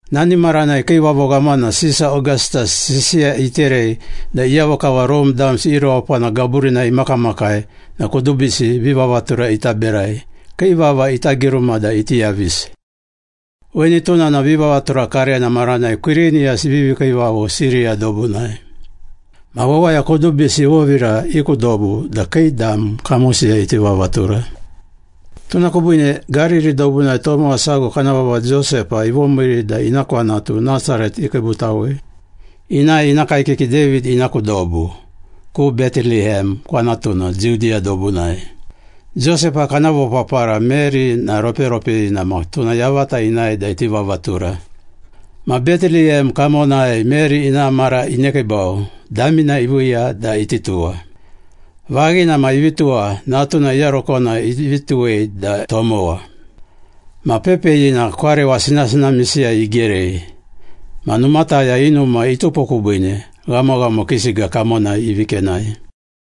Nani maranai kiivavo ghamana Sisa Ogastas sisiya iterei da iyavo kava Rome damsi i rewapana gaburinai imakamakai na kudubisi vivavatura ita berai, kii vava ita giruma da iti yavisi. Weni tuna na vivavatura karena maranai Kwiriniyas ivivi kiivavo Siriya dobunai. Ma wawaya kudubisi ivovira i ku dobu da kii dam kamosiyai iti vavatura. Tuna kubiine Gariri dobunai tomowa sago kana vava Josepa ivomiiri da ina kwanatu Nasaret ikiibutawei. Inae ina kaekiki David ina ku dobu, ku Beteliyem kwanatuna Judiya dobunai. Josepa kana vopapara Meri na roperopeyina ma tuna yavata inae da iti vavatura. Ma Beteliyem kamonai Meri ina mara inekiibau, damina iviiya da iti tuwa. Vaghina ma ivi tuwa, natuna iyarokona ivi tuwei da tomowa. Ma pepeyina kwarewa sinasinamisiyai igerei. Ma numataya i numa itupo kubiine, ghamoghamo kii siga kamonai ivi kenai.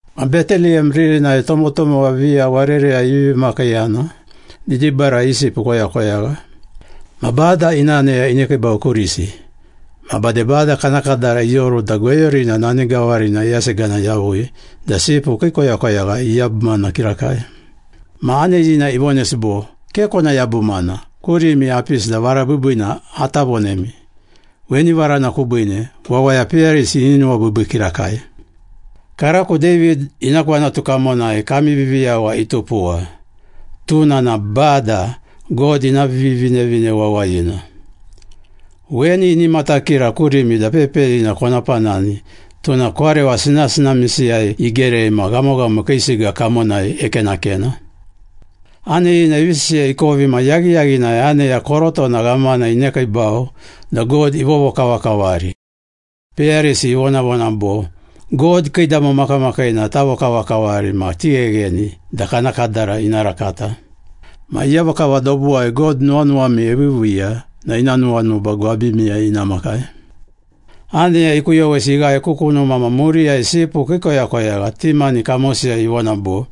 Ma Beteliyem ririnai tomotomowa viya warereyai ivivi makiiyana, didibarai i sipu ikoyakoyagha. Ma Bada ina aneya inekiibau kurisi, ma bade Bada kana kadara ioru da gweyurina nani gawarina iyasegana yavui da sipu kii koyakoyagha iyabumana kirakai. Ma aneyina ivonesi bo, “Ke kona yabumana. Kurimi apisi da vara biibiina ata vonemi. Weni varana kubiine, wawaya peyarisi ini nuwabiibii kirakai. Karako David ina kwanatu kamonai kami Viviyawa itupuwa. Tuna na Bada, God ina Vivinevine Wawayina. Weni ini matakira kurimi da pepeyina kona panani, tuna kwarewa sinasinamisiyai igerei ma ghamoghamo kii siga kamonai ekenakena.” Aneyina ivi sisiya ikovi na yaghiyaghinai aneya korotona ghamana inekiibau da God ivovokavakavari. Peyarisi ivonavona bo, “God kiidamo makamakiina tavokavakavari ma tighegheni da kana kadara ina rakata. Ma iyavo kava dobuwai God nuwanuwami eviiviiya na ina nuwanuba gwabimiyai ina makai.” Aneya ikuyowesi ighae ku kunuma na muriyai sipu kii koyakoyagha ti mani kamosiyai ivona bo,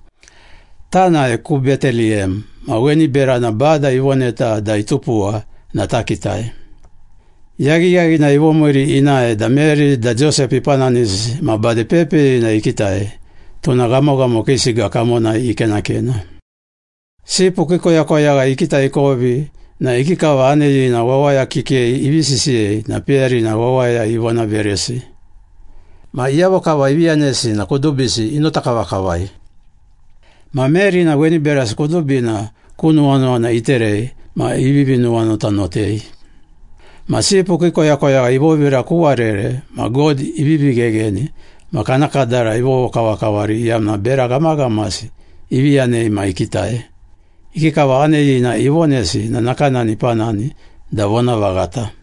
“Tanae ku Beteliyem. Ma weni berana Bada ivoneta da itupuwa na takitai.” Yaghiyaghinai ivomiiri inae da Meri da Josepa ipananisi ma bade pepeyina ikitai, tuna ghamoghamo kii siga kamonai ikenakena. Sipu kii koyakoyagha ikitai ikovi na ikikava aneyina wawaya kikei ivi sisiyei na peyarina wawaya ivonaveresi. Ma iyavo kava ivi yanesi na kudubisi inota kavakavai. Ma Meri na weni berasi kudubina ku nuwanuwana iterei ma ivivi nuwanotanotei. Ma sipu kii koyakoyagha ivovira ku warere ma God ivivi ghegheni ma kana kadara ivovokavakavari iyamna bera ghamaghamasi ivi yanei ma ikitai. Ikikava aneyina ivonesi na nakanani ipanani da vonavaghata.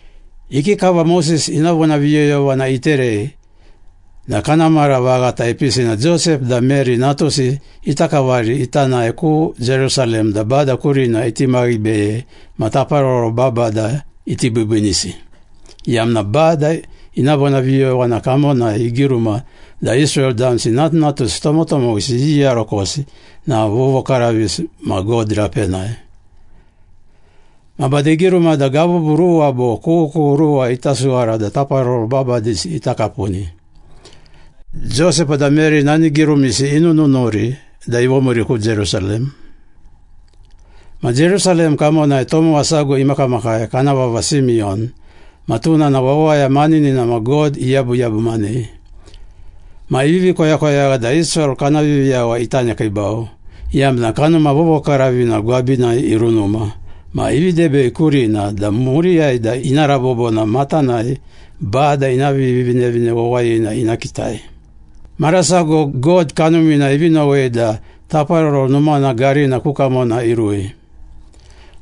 Ikikava Moses ina vonaviyoyovana iterei na kana mara vaghata ipisi na Josepa da Meri natusi ita kavari ita nae ku Jerusalem da Bada kurina iti maghibeyei ma taparoro babada iti biibiinisi, iyamna Bada ina vonaviyoyovana kamonai igiruma da Israel damsi natunatusi tomotomowisi iyiyarokosi na vovokaravisi ma God rapenai. Ma bade igiruma da gabubu ruwa bo kughukughu ruwa ita suwara da taparoro babadisi ita kapuni. Josepa da Meri nani girumisi inununuri da ivomiiri ku Jerusalem. Ma Jerusalem kamonai tomowa sago imakamakai, kana vava Simiyon ma tuna na wawaya maninina ma God iyabuyabumanei. Ma ivivi koyakoyagha da Israel kana Viviyawa ita nekiibau, iyamna Kanuma Vovokaravina gwabinai irunuma ma ivi debei kurina da muriyai da ina rabobo na matanai Bada ina Vivinevine Wawayina ina kitai. Mara sago God Kanumina ivi nowei da Taparoro Numana garina ku kamona irui.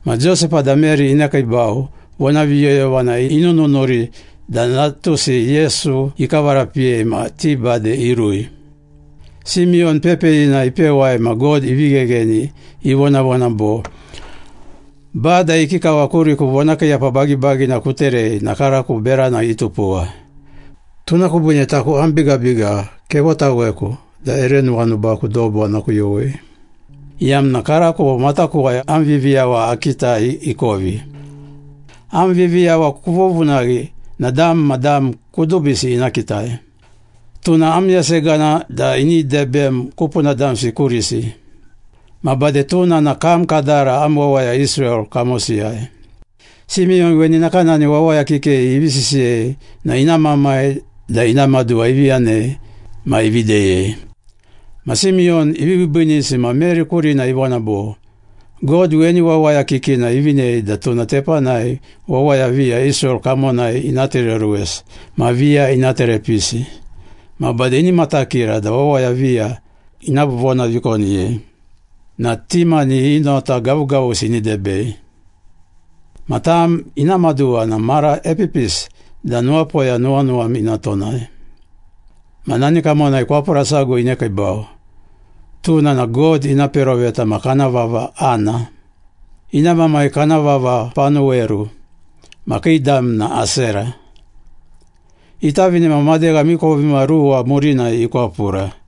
Ma Josepa da Meri inekiibau, vonaviyoyovana inununuri da natusi Yesu ikavarapiyei ma ti bade irui. Simiyon pepeyina ipewai ma God ivi ghegheni, ivonavona bo, “Bada, ikikava kuriku vonakiiyapa bagibagina kuterei na karako berana itupuwa. Tuna kubiine taku am bigabiga kevotaweku da ere nuwanubaku dobu ana kuyowei, Iyamna karako matakuwai am Viviyawa akitai ikovi, Am Viviyawa kuvovunaghi na dam ma dam kudubisi ina kitai. Tuna am yasegana da ini debem kupuna damsi kurisi, Ma bade tuna na kam kadara am wawaya Israel kamosiyai.” Simiyon weni nakanani wawaya kikei ivi sisiyei na ina mamai da ina maduwa ivi yanei ma ivi deyei. Ma Simiyon ivi biibiinisi ma Meri kurina ivona bo, “God weni wawaya kikina ivinei da tuna tepanai wawaya viya Israel kamonai ina tereoruwesi ma viya ina terepisi. Ma bade ini matakira da wawaya viya ina vonavikoniyei na ti mani i nota gavugavusi ini debei. Ma tam ina maduwa na mara epipisi da nuwapoya nuwanuwam ina tonai.” Ma nani kamonai kwapura sago inekiibau. Tuna na God ina peroveta ma kana vava Ana. Ina mamai kana vava Panuweru ma kii dam na Asera. Itavine ma madegha miikovimaruwa murinai ikwapura.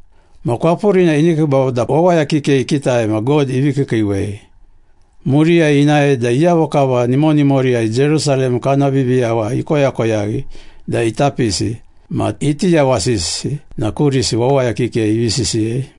Ma kwapurina inekiibau da wawaya kikei ikitai ma God ivi kiikiiwei. Muriyai inae da iyavo kava nimonimoriyai Jerusalem kana Viviyawa ikoyakoyaghi da ita pisi ma iti yawasisi na kurisi wawaya kikei ivi sisiyei.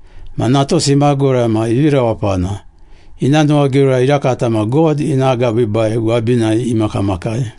Ma natusi imagura ma ivi rewapana. Ina nuwagiura irakata ma God ina agabiibai gwabinai imakamakai.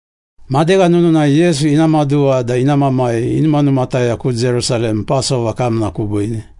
Madegha nununai Yesu ina maduwa da ina mamai inumanumataya ku Jerusalem Pasova kamna kubiine.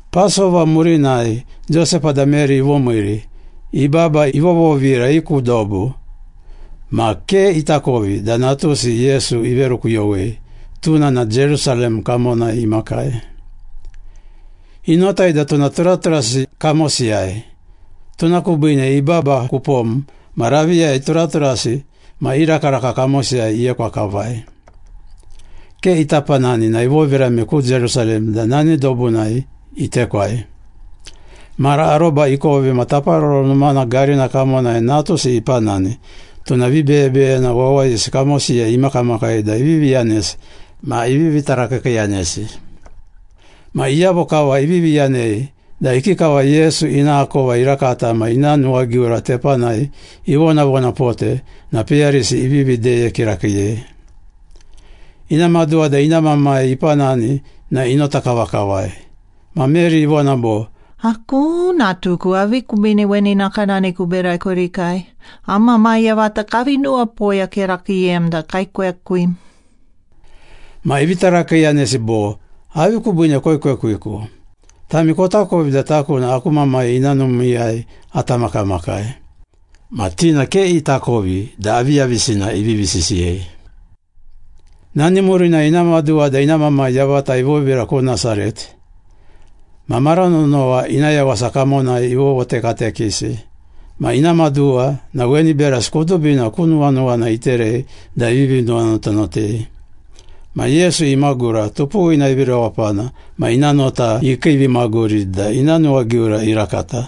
Pasova murinai Josepa da Meri ivomiiri, ibaba ivovovira i ku dobu. Ma ke itakovi da natusi Yesu iverukuyowei, tuna na Jerusalem kamonai imakai. Inotai da tuna turaturasi kamosiyai. Tuna kubiine ibaba ku pom ma raviyai turaturasi ma i rakaraka kamosiyai iekwa kavai. Ke ita panani na ivovirame ku Jerusalem da nani dobunai itekwai. Mara aroba ikovi ma Taparoro Numana garina kamonai natusi ipanani, tuna vibeyebeyena wawayisi kamosiyai imakamakai da ivivi yanesi ma ivivi tarakiikiiyanesi. Ma iyavo kava ivivi yanei da ikikava Yesu ina akova irakata ma ina nuwagiura tepanai ivonavonapote na peyarisi ivivi deye kirakiiyei. Ina maduwa da ina mamai ipanani na inota kavakavai. Ma Meri ivona bo, “Akuu! Natuku, avi kubiine weni nakanani kuberai kurikai? Am mamai yavata kavi nuwapoya kirakiiyem da kaekwekwim.” Ma ivi tarakiiyanesi bo, “Avi kubiine koekwekwiku? Tami kotakovi da taku na aku Mamai ina numiiyai ata makamakai.” Ma ti na ke itakovi da aviyavisina ivivi sisiyei. Nani murinai ina maduwa da ina mamai yavata ivovira ku Nasaret. Ma mara nonowa ina yawasa kamonai ivovotekatekesi. Ma ina maduwa na weni berasi kudubina ku nuwanuwana iterei da ivivi nuwanotanotei. Ma Yesu imagura, tupuwina ivi rewapana ma ina nota ikiivimaguri da ina nuwagiura irakata.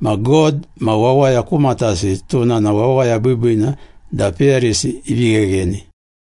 Ma God ma wawaya ku matasi tuna na wawaya biibiina da peyarisi ivi ghegheni.